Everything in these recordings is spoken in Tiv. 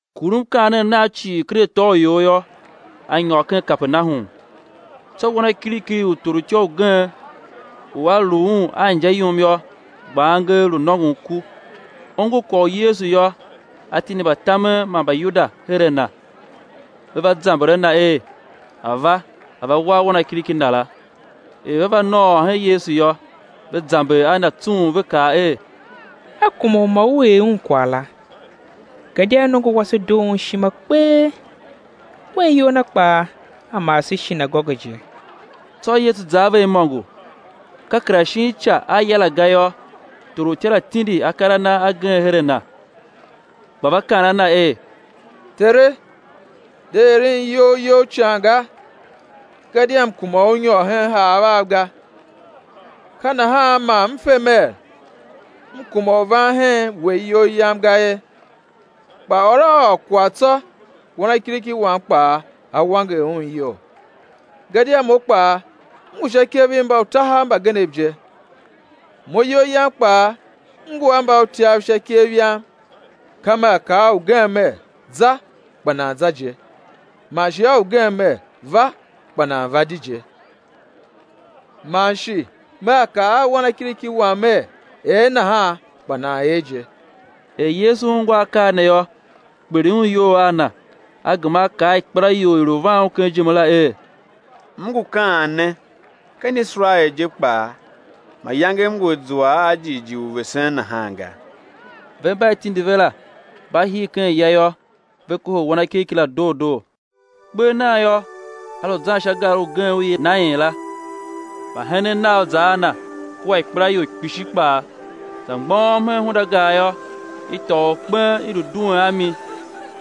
Kur mkaanem Nam cii ken ato a ior yô, A nyôr ken Kapernahum. Tsô wanakiriki u torutya ugen, u a lu un a inja yum yô, gba angev lu nôngon ku. Ongo kwagh u Yesu yô, a tindi mbatamen mba Mbayuda her a Na, ve va zamber a Na er A̱ va, A̱ va war wanakiriki na la. Er ve va nôôr hen Yesu yô, ve zamber a Na tsung ve kaa er: A kuma u ma U er un kwagh la, gadia nongo wase doo un ishima kpee, wen iyol na kpaa a maa se shinagoge je. Tsô Yesu za a ve imôngo. Ka kera shin ica a ya la ga yô, torutya la tindi akar a na agen her a Na gba va kaan a Na er: Tere, de eren iyol You ican ga, gadia m kuma u U nyôr hen haav av ga, ka nahan man m fe mer, m kuma u van hen We iyol yam ga ye; kpa ôr a ôr kwagh tsô, wanakiriki wam kpaa á wanger un iyol. Gadia mo kpaa, m ngu sha ikev i mbautahav mbagenev je; mo iyol yam kpaa m ngu a mbautyav sha ikev yam; ka mea kaa a ugen mer: Za, kpa nan za je; man shi a ugen mer: Va kpa nan va di je; man shi mea kaa a wanakiriki wam mer: Er nahan, kpa nan er je. Er Yesu ungwa akaa ne yô, kpiligh Un iyol a na; A gema A kaa a ikpelaior i i lu van Un ken ijime la er: M ngu kaan ne, ken Iserael je kpaa mayange M ngu a zua a jighjigh u vesen nahan ga. Ve mba i tindi ve la, mba hir ken ya yô, ve kohol wanakiriki la doo doo. Kper nan yô, A lu zan sha gar ugen u i yilan er, Nain la; mbahenen Nav za a Na, kua ikpelaior kpishi kpaa. Za mgbôghom hen hundagar yô, i tôô orkpen i lu duen a mi,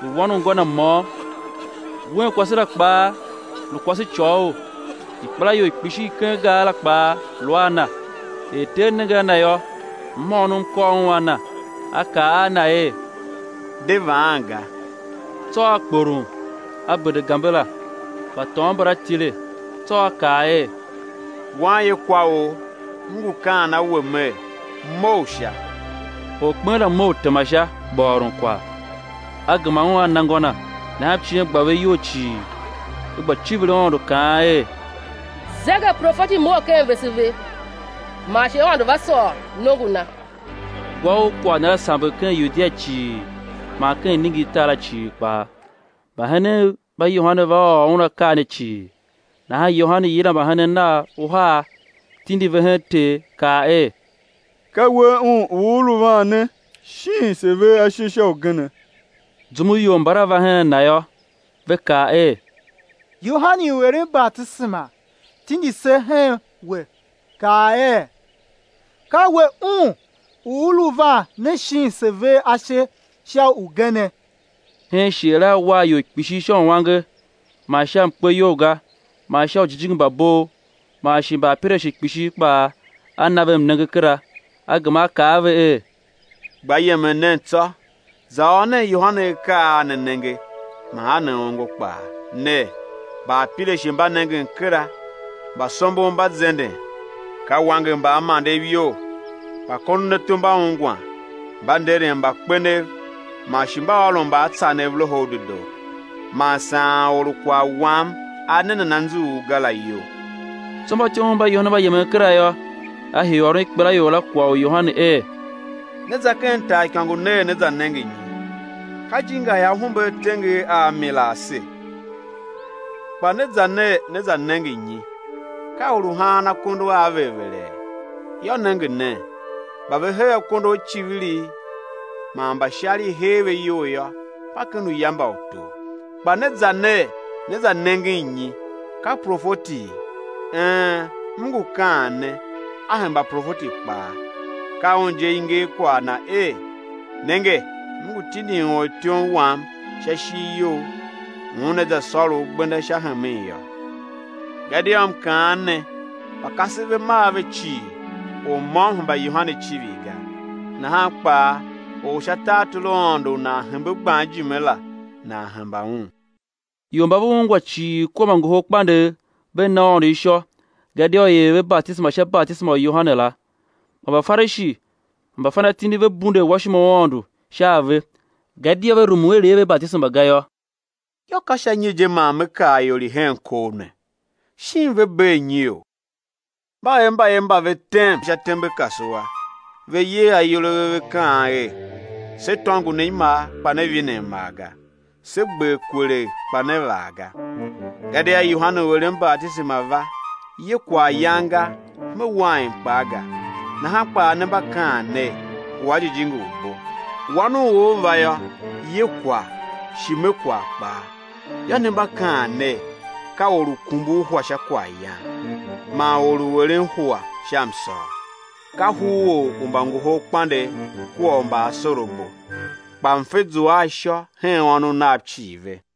lu wan u ngô na môm; un kwase la kpaa lu kwasecôghol. Ikpelaior kpishi i ken gar la kpaa lu a na. Er Ter nenge a Na yô, mhôônom kôr Un a na, A kaa a na er: De vaan ga. Tsô A kporom, A bende gambe la. Mbatôôn mbala tile; tsô A kaa er: Wanyekwaor, M ngu kaan a̱ we Mer Mough sha! Orkpen la mough, tema sha, gba ôron kwagh. A gema un A na ngô na. Nahan mciem gba ve iyol cii, ve gba civir Aôndo kaan er: Zegeprofeti mough ken vese ve; man shi Aôndo va sôr nongo Na. Gwa u kwagh Na la samber ken Yudia cii man ken iningirtar la cii kpaa. Mbahenen mba Yohane va ôr un akaa ne cii. Nahan Yohane yila mbahenen nav uhar, tindi ve hen Ter, kaa er: Ka We Un u U lu van ne, shin se̱ ver ashe sha ugene? Zum u ior mbala va hen Na yô, ve kaa er: Yohane u eren batisema tindi se hen We kaa er: Ka We Un u U lu van ne shin se̱ ver ashe sha ugene? Hen shighe la A war ior kpishi sha uange man sha umkpeyolga man sha ujijingi mba bov, man shi mbaapirashe kpishi kpaa A na ve mnenge kera. A gema A kaa a ve er: Gba yemen nen tsô, za ôr nen Yohane akaa a ne nenge man a ne ongo kpaa, ner: Mbaapirashe mba nengen kera, mbasombon mba zenden; ka wanger mbaamandev iyol, mbakondonato mba ungwan, mba nderen mbakpenev, man shi mba ôron mbaatsanev Loho u Dedoo. Man saan or u kwagh Wam a ne nan anzughul ga la iyol. Tsô mbatyomov mba Yohane mba yemen kera yô, A hii u ôron ikpelaior la kwagh u Yohane er: Ne za ken taaikôngo ner, né za nenge nyi? Ka ijinga i ahumbe a tenger a mi la ase? Kpa ne za ner, né za nenge nyi? Ka or u haan akondo a ver vere? Yô, nenge nen, mba ve hee akondo a icivirigh, man mba ishar i hee ve iyol yô, mba ken uya mba utor. Kpa ne za ner, ne za nenge nyi? Ka profeti? Een, M ngu kaan ne, a hemba profeti kpaa. Ka un je i nger kwagh na er: Nenge, M ngu tindin ortyom Wam sha ishigh You, u una za sôr U gbenda sha hemen yô. Gadia M kaan ne, mba kasev ve mar ve cii, or môm hemba Yohane icivir ga; nahan kpaa or u sha tartor u Aôndo u nan hembe gban ijime la nan hemba un. Ior mba ve ungwa cii kua mbangoholkpandegh, ve na Aôndo ishô, gadia i er ve batisema sha batisema u Yohane la. Kpa Mbafarishi man mbafanatindi ve bunde awashima u Aôndo sha a ve, gadia ve rumun i̱ er ve batisema ga yô. Yô, ka sha nyi je man Me kar ior i hen kov ne? Shin ve bee nyiou? Mba er mbayev mba ve tem sha tembe kasua, ve yer ayol a ve, ve kaan er: Se tôngo ne imar, kpa ne vine amar ga; se gber kwelegh, kpa ne vaa ga. Gadia Yohane u eren batisema va, ye kwaghyan ga, me wain kpaa ga, nahan kpaa ne mba kaan ner: Ngu a jijingi u bo. Wan u or va yô, ye kwagh, shi me kwagh kpaa; yô, ne mba kaa ner: Ka or u kumbur hua sha kwaghyan, man or u eren hua sha msôr, ka huror u mbangoholkpandegh kua u mbaasorabo. Kpa mfe zua a ishô hen ônov nav cii ve.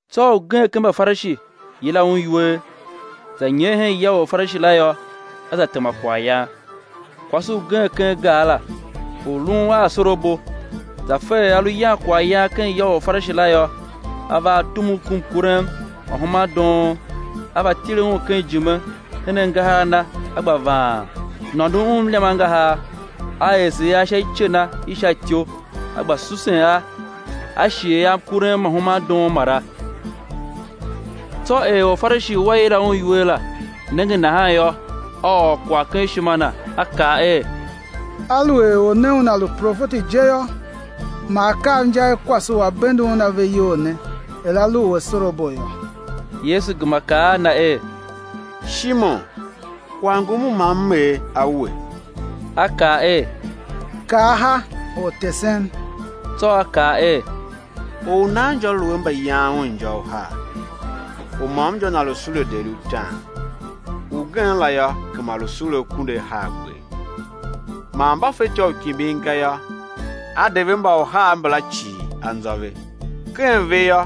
Tsô ugen ken Mbafarishi yila Un iwer. Za nyer hen ya u Orfarishi la yô, A za tema kwaghyan. Kwase ugen ken gar la, u lun a asorabo, za fe er A lu yan kwaghyan ken ya u Orfarishi la yô, a va a tumugh ku mkurem ma human doon. A va tile Un ken ijime hen angahar a Na, a gba vaan, nôndon Un mliam angahar, a ese a sha ice na i sha ityou, a gba susen a, a shighe a mkurem ma human doon mara. Tsô er Orfarishi u a yila Un iwer la, nenge nahan yô, a ôr kwagh ken ishima na, a kaa er: Aluer Or ne Una lu profeti je yô, ma A kav inja i kwase u a bende Un ave iyol ne, er a lu u asorabo yô. Yesu gema kaa a na er: Shimon, kwagh ngum u ma M er a we. A kaa er: Kaa ha, Ortesen. Tsô A kaa er: Or u nan injô lu a mbayan un injô uhar; u môm injô na lu sule deri utaan ugen la yô, gema lu sule akunduahargber. Man mba fetyô u kimbin ga yô, a de ve mbauhar mbala cii anzô ve. Ken ve yô,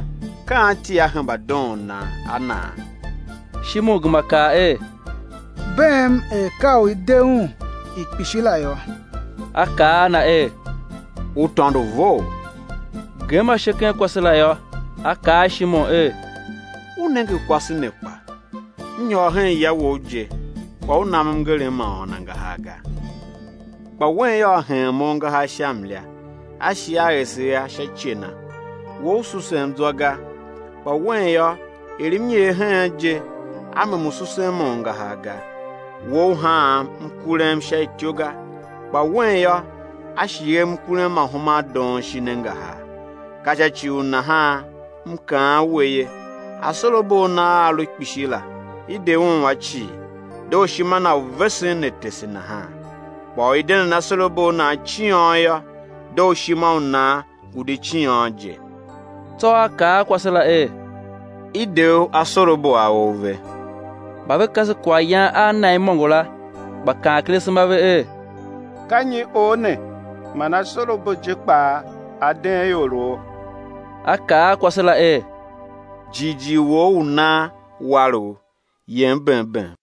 ka anti á hemba doon nan a naa? Shimon gema kaa er: Beem er ka u i de un i kpishi la yô. A kaa a na er: U tôndo vough. Gem ashe ken kwase la yô, A kaa a Shimon er: U nenge kwase ne kpa? M nyôr hen ya wou je, kpa u nam mngerem ma ôôn angahar ga; kpa wen yô, a heen Mo angahar sha mlia, a shi a ese a sha ice na. We u susem zwa ga; kpa wen yô, er M nyer heen je, a mem u susen Mo angahar ga. We, u haam mkurem sha ityou ga; kpa wen yô, a shighem mkurem ma human doon shin angahar. Ka sha ci u nahan M kaan we ye, asorabo a na a a lu kpishi la, i de un a cii; dooshima na u vesen ne tese nahan; kpa u i de nan asorabo a nan ciôn yô, dooshima u nan ngu di ciôn je. Tsô A kaa a kwase la er: I de u asorabo a ou ve. Mba ve kase kwaghyan a Na imôngo la, gba kaan ken asema a ve er: Ka nyi Or ne man asorabo je kpaa A deen ioroo? A kaa a kwase la er: Jighjigh wou u nan war u; yem bem bem.